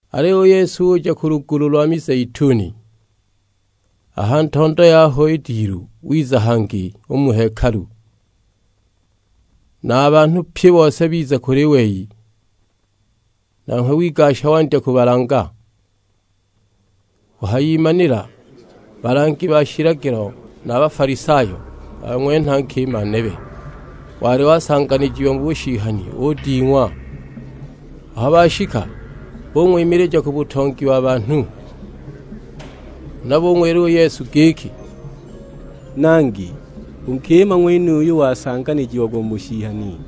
Aliyo u Yesu uja ku lugulu lwa mizeituni. A ha ntondo yaho i dilu wiza hangi u mu hekalu; na a banhu pye a bose biza u kuli we, nanghwe wigasha wandya kubalanga. Kuhayimanila balangi ba shilagilo na Bafalisayo bang'wenha nkima nebe, wali wasanganijiwa mu bushihani uding'wa; aho bashika bung'wimilija ku butongi wa banhu. Huna bung'wila u Yesu giki, "Nangi, u nkima ng'wenuyu wasanganijiagwa mu bushihani.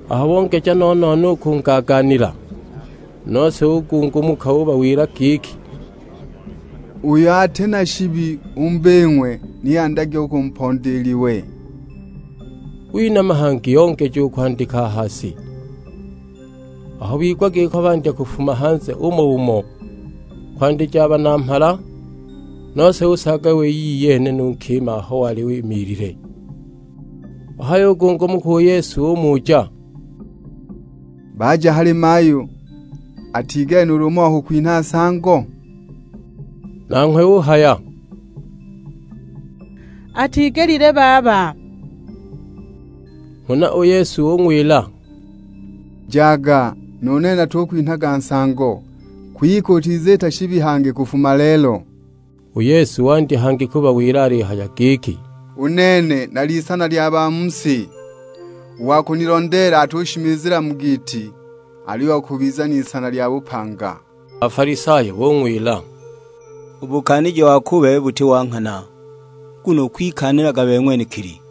Aho bongeja no-no-no u kungaagaanila, nose ugungumuka ubawila giki, "Uyo ati na shibi u mu bing'we ni andyage u kumponda i liwe." Winama hangi ongeja u kwandika a ha si. Aho bigwa giko bandya kufuma hanze umo-umo, kwandija a banamhala; nose usaaga wei iyene nu nkima aho wali imiilile. Wahayugungumuka u Yesu umuja, "Baja hali mayu, atigelile nuulu umo wa kukwinha nsango?" Nanghwe uhaya, "Atigelile baba!" Huna u Yesu ung'wila, "Jaga, nu nene natukwinhaga nsango; kwike utiziita shibi hangi kufuma lelo!"] U Yesu wandya hangi kubawila alihaya giki, "U nene nali Isana lya ba mu si; u wa kunilondeela atushimizila mu giiti, aliyo akubiza n'isana lya bupanga." A Bafalisayo bung'wila, "U bukaaniji wako u bebe buti bo nghana, nguno ukwikaanilaga bebe ng'wenekili."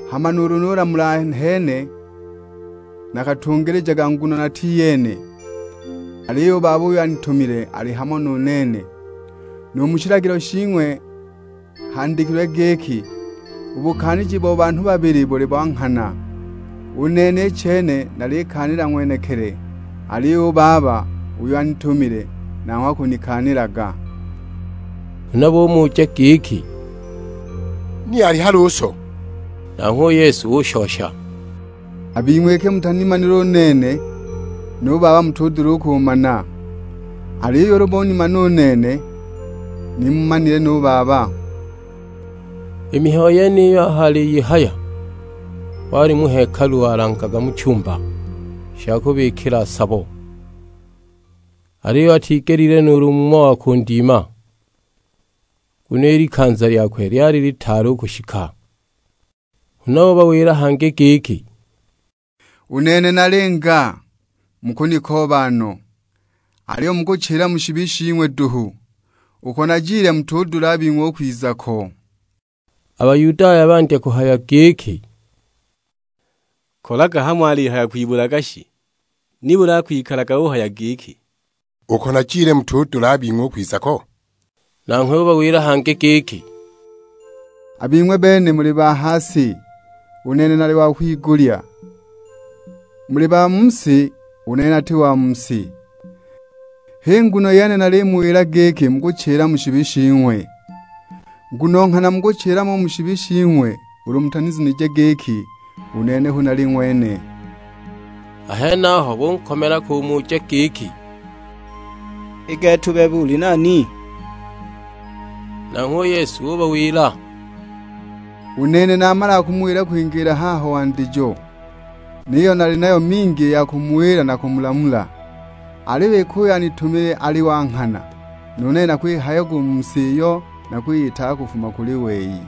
Hama nuulu nulamula nahene, nakatungilijaga nguno nati iyene, aliyo u Baba uyo anitumile ali hamo nu nene. Nu mu shilagilo shing'we handikilwe giki, u bukaaniji bo banhu babili buli bo nghana. U nene i chene nalikaanila ng'wenekili, aliyo nu Baba uyo anitumile, nanghwe akunikaanilaga." Huna bumuja giki, "Ni ali hali u so?" Nanghwe u Yesu ushosha, "A bing'we iki mutanimanile u nene, nu Baba mutudula u kumana; aliyo ulu ni munimanile u nene, ni mumanile nu Baba." I mihayo yeniyi aho aliyihaya, wali mu hekalu walangaga mu chumba sha kubikila sabo; aliyo atigelile nuulu umo wa kundima. Nguno i likanza lyakwe lyali litaali u kushika. Huna ubawila hangi giki, "U nene nalinga; mukunikooba no, aliyo mukuchila mu shibi shing'we duhu: uko najile mutudula a bing'we u kwiza ko." A Bayudaya bandya kuhaya giki, "Kolaga hamo alihaya kwibulaga shi, nibuli akwikalaga uhaya giki, 'Uko najile mutudula a bing'we u kwiza ko?' " Nanghwe ubawila hangi giki, "A bing'we bene muli ba ha si, u nene nali wa kwigulya, muli ba mu si, u nene nati wa mu si. H'i nguno yene nalimuwila giki mukuchila mu shibi shing'we; nguno nghana mukuchila mo u mu shibi shing'we ulu mutazunije giki u nene hu Nali Ng'wene." A henaho bunkomela kumuja giki, "I gete u bebe, uli nani?" Nanghwe u Yesu ubawila, "U nene namalaga kumuwila kwingiila haho wandijo! Niyo nali nayo mingi i ya kumuwila na kumulamula, aliyo iki uyo anitumile ali wa nghana, nu nene nakwihayaga u mu si iyo nakwiyigwaga kufuma kuli we."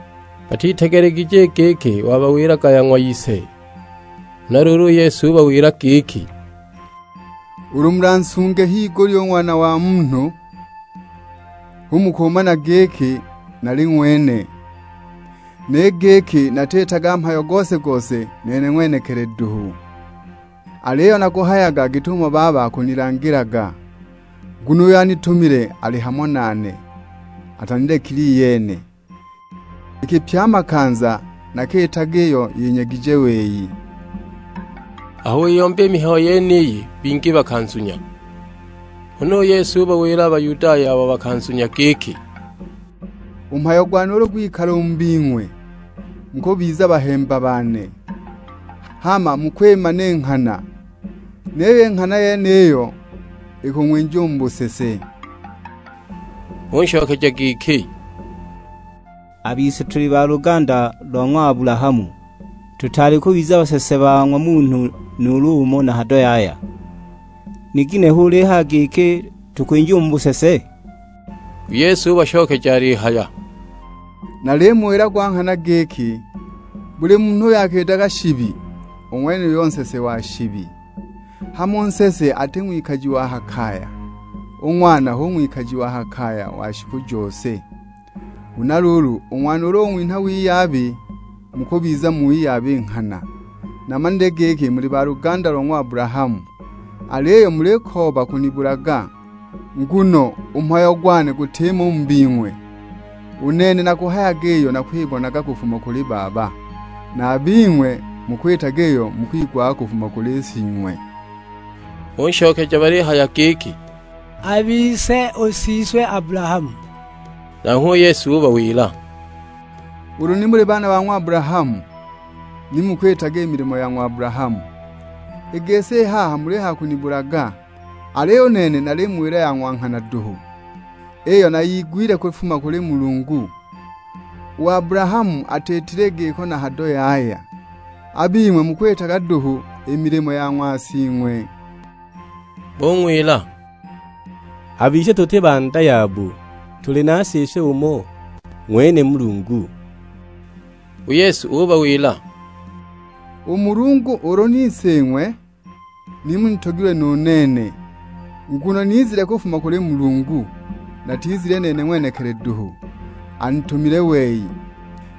Batitegelegije i giki wabawilaga ya ng'wa Ise. Huna luulu u Yesu ubawila giki, "Ulu mulansunge higulya u Ng'wana wa Munhu, hu mukumana giki Nali Ng'wene, ni giki natiitaga mhayo gose-gose nene ng'wenekili duhu. Aliyo nakuhayaga git'umo Baba akunilangilaga. Nguno uyo anitumile ali hamo nane; atanilekile iyene, iki pye a makanza nakiitaga iyo yinyegije wei." Aho wiyomba i mihayo yeniyi bingi bakanzunya. Huna u Yesu ubawila a Bayudaya abo bakanzunya giki, "U mhayo gwane ulu gwikala u mu bing'we, mukubiza bahemba bane. Hama mukwimana i nghana, niyo i nghana yeniyo ikung'winja u mu busese." Bunshokeja giki, "A bise tuli ba luganda lo ng'wa Abulahamu, tutaali kubiza basese ba ng'wa munhu nuulu umo na hado yaya. Ni ginehe ulihaya giki tukwinjiwa mu busese?" U Yesu ubashokeja alihaya, "Nalimuwila gwa nghana giki, buli munhu uyo akiitaga shibi, u ng'wenuyo nsese wa shibi. Hama u nsese ati ng'wikaji wa ha kaya, u ng'wana hu ng'wikaji wa ha kaya wa shiku jose. Huna luulu u Ng'wana ulu ung'winha wiyabi, mukubiza mu wiyabi nghana. Namanile giki muli ba luganda lo ng'wa Abulahamu; aliyo mulikooba kunibulaga, nguno u mhayo gwane gutimo u mu bing'we. U nene nakuhayaga iyo nakwibonaga kufuma kuli Baba, na a bing'we mukwitaga iyo mukigwaga kufuma kuli sing'we." Bunshokeja balihaya giki, "A bise u siswe Abulahamu." Nanghwe u Yesu ubawila, "Ulu ni muli baana ba ng'wa Abulahamu, ni mukwitaga i milimo ya ng'wa Abulahamu. I gisi i haha mulihaya kunibulaga, aliyo u nene nalimuwila ya ng'wa nghana duhu, iyo nayigwile kufuma kuli Mulungu; u Abulahamu atiitile i giko na hado yaya. A bing'we mukwitaga duhu i milimo ya ng'wa sing'we." Bung'wila, "A bise tuti ba nda ya bu; tuli na Siswe umo, ng'wene Mulungu." U Yesu ubawila, "U Mulungu ulu ni Sing'we ni munitogilwe nu nene, nguno nizile kufuma kuli Mulungu, natizile nene ng'wenekili duhu, anitumile wei.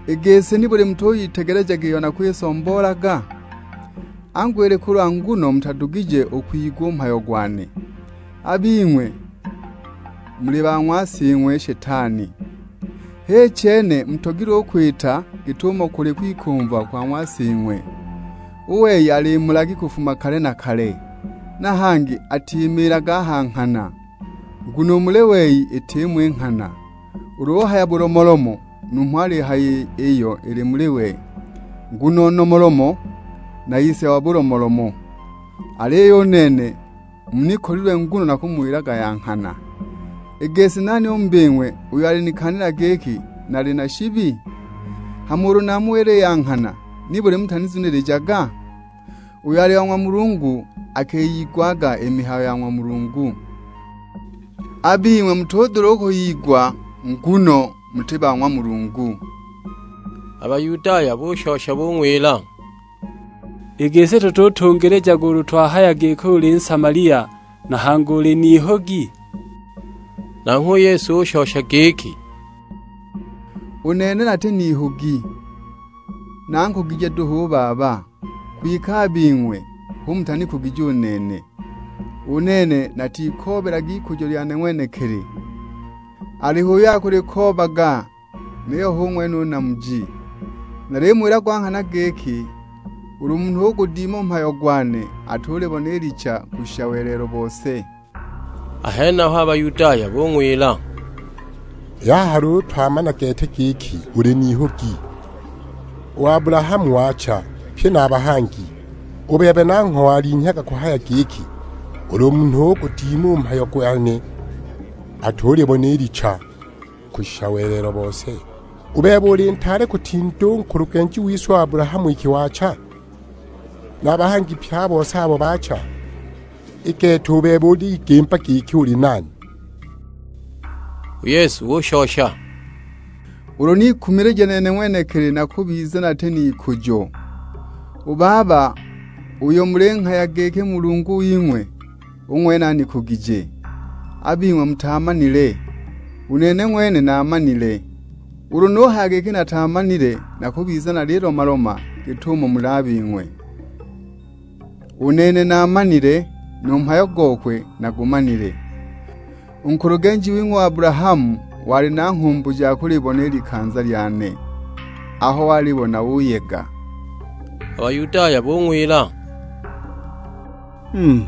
I gisi nibuli mutuyitegelejaga iyo nakwisomboolaga? Angu ili kulwa nguno mutadugije u kugwigwa u mhayo gwane. A bing'we muli ba ng'wa sing'we Shetani, h'i chene mutogilwe u kwita git'umo kuli u kwikumva kwa ng'wa sing'we. U wei ali mulagi kufuma kale na kale, na hangi atimiilaga a ha nghana, nguno u muli wei itimo i nghana. Ulu uhaya bulomolomo numho alihaya iyo ili muli we, nguno nomolomo, na ise wa bulomolomo. Aliyo u nene, munikolilwe nguno nakumuwilaga ya nghana. I gisi nani u mu bing'we uyo alinikaanila giki nali na shibi? Hama ulu namuwila i ya nghana, nibuli mutunizunilijaga? Uyo ali wa ng'wa Mulungu akiyigwaga i mihayo ya ng'wa Mulungu, a bing'we mutudula u kwiyigwa nguno muti ba ng'wa Mulungu." A Bayudaya bushosha bung'wila, "I gisi tututungilijaga ulu twahaya giki uli Nsamalia na hangi uli n'ihugi?" Nanghwe u Yesu ushosha giki, "U nene nati n'ihugi, nankugije duhu u Baba, kwike a bing'we hu mutanikugije u nene. U nene natikoobelaga ikujo lyane ng'wenekili; aliho uyo akulikoobaga, niyo hu ng'wene u namuji. Nalimuwila gwa nghana giki, ulu munhu ugudima u mhayo gwane atulibona i licha kushisha welelo bose." A henaho a Bayudaya bung'wila, "I haha luulu twamana gete giki uli n'ihugi. U Abulahamu waacha, pye na a bahangi; u bebe nangho walinhyaga kuhaya giki, 'Ulu munhu ugudima u mhayo gwane atulibona i licha kushisha welelo bose!' U bebe uli ntaale kutinda u nkulugenji wise u Abulahamu iki waacha, na a bahangi pye a bose abo baacha? I gete, u bebe uligimba giki uli nani?" U Yesu ushosha, "Ulu nikumilija nene ng'wenekili nakubiza nati n'ikujo; u Baba uyo mulinghaya giki Mulungu wing'we, u ng'wene anikugije. A bing'we mutaamanile, u nene ng'wene naamanile. Ulu nuhaya giki nataamanile nakubiza nalilomaloma git'umo muli a bing'we; u nene naamanile, nu mhayo gokwe nagumanile. U nkulugenji wing'we u Abulahamu wali na nghumbu ja kulibona i likanza lyane, aho walibona uyega." A Bayudaya bung'wila, "Mm!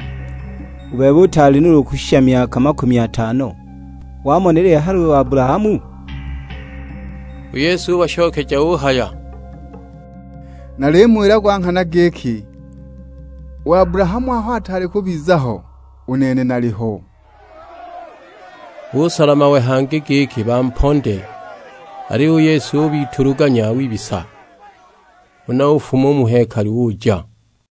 U bebe utaali nuulu kushisha myaka makumi atano, wamonelile hali u Abulahamu?" U Yesu ubashokeja uhaya, "Nalimuwila gwa nghana giki, u Abulahamu aho ataali u kubiza ho, u Nene naliho!" Busola mawe hangi giki bamponde, aliyo u Yesu ubituluganya wibisa; huna ufuma u mu hekalu uja.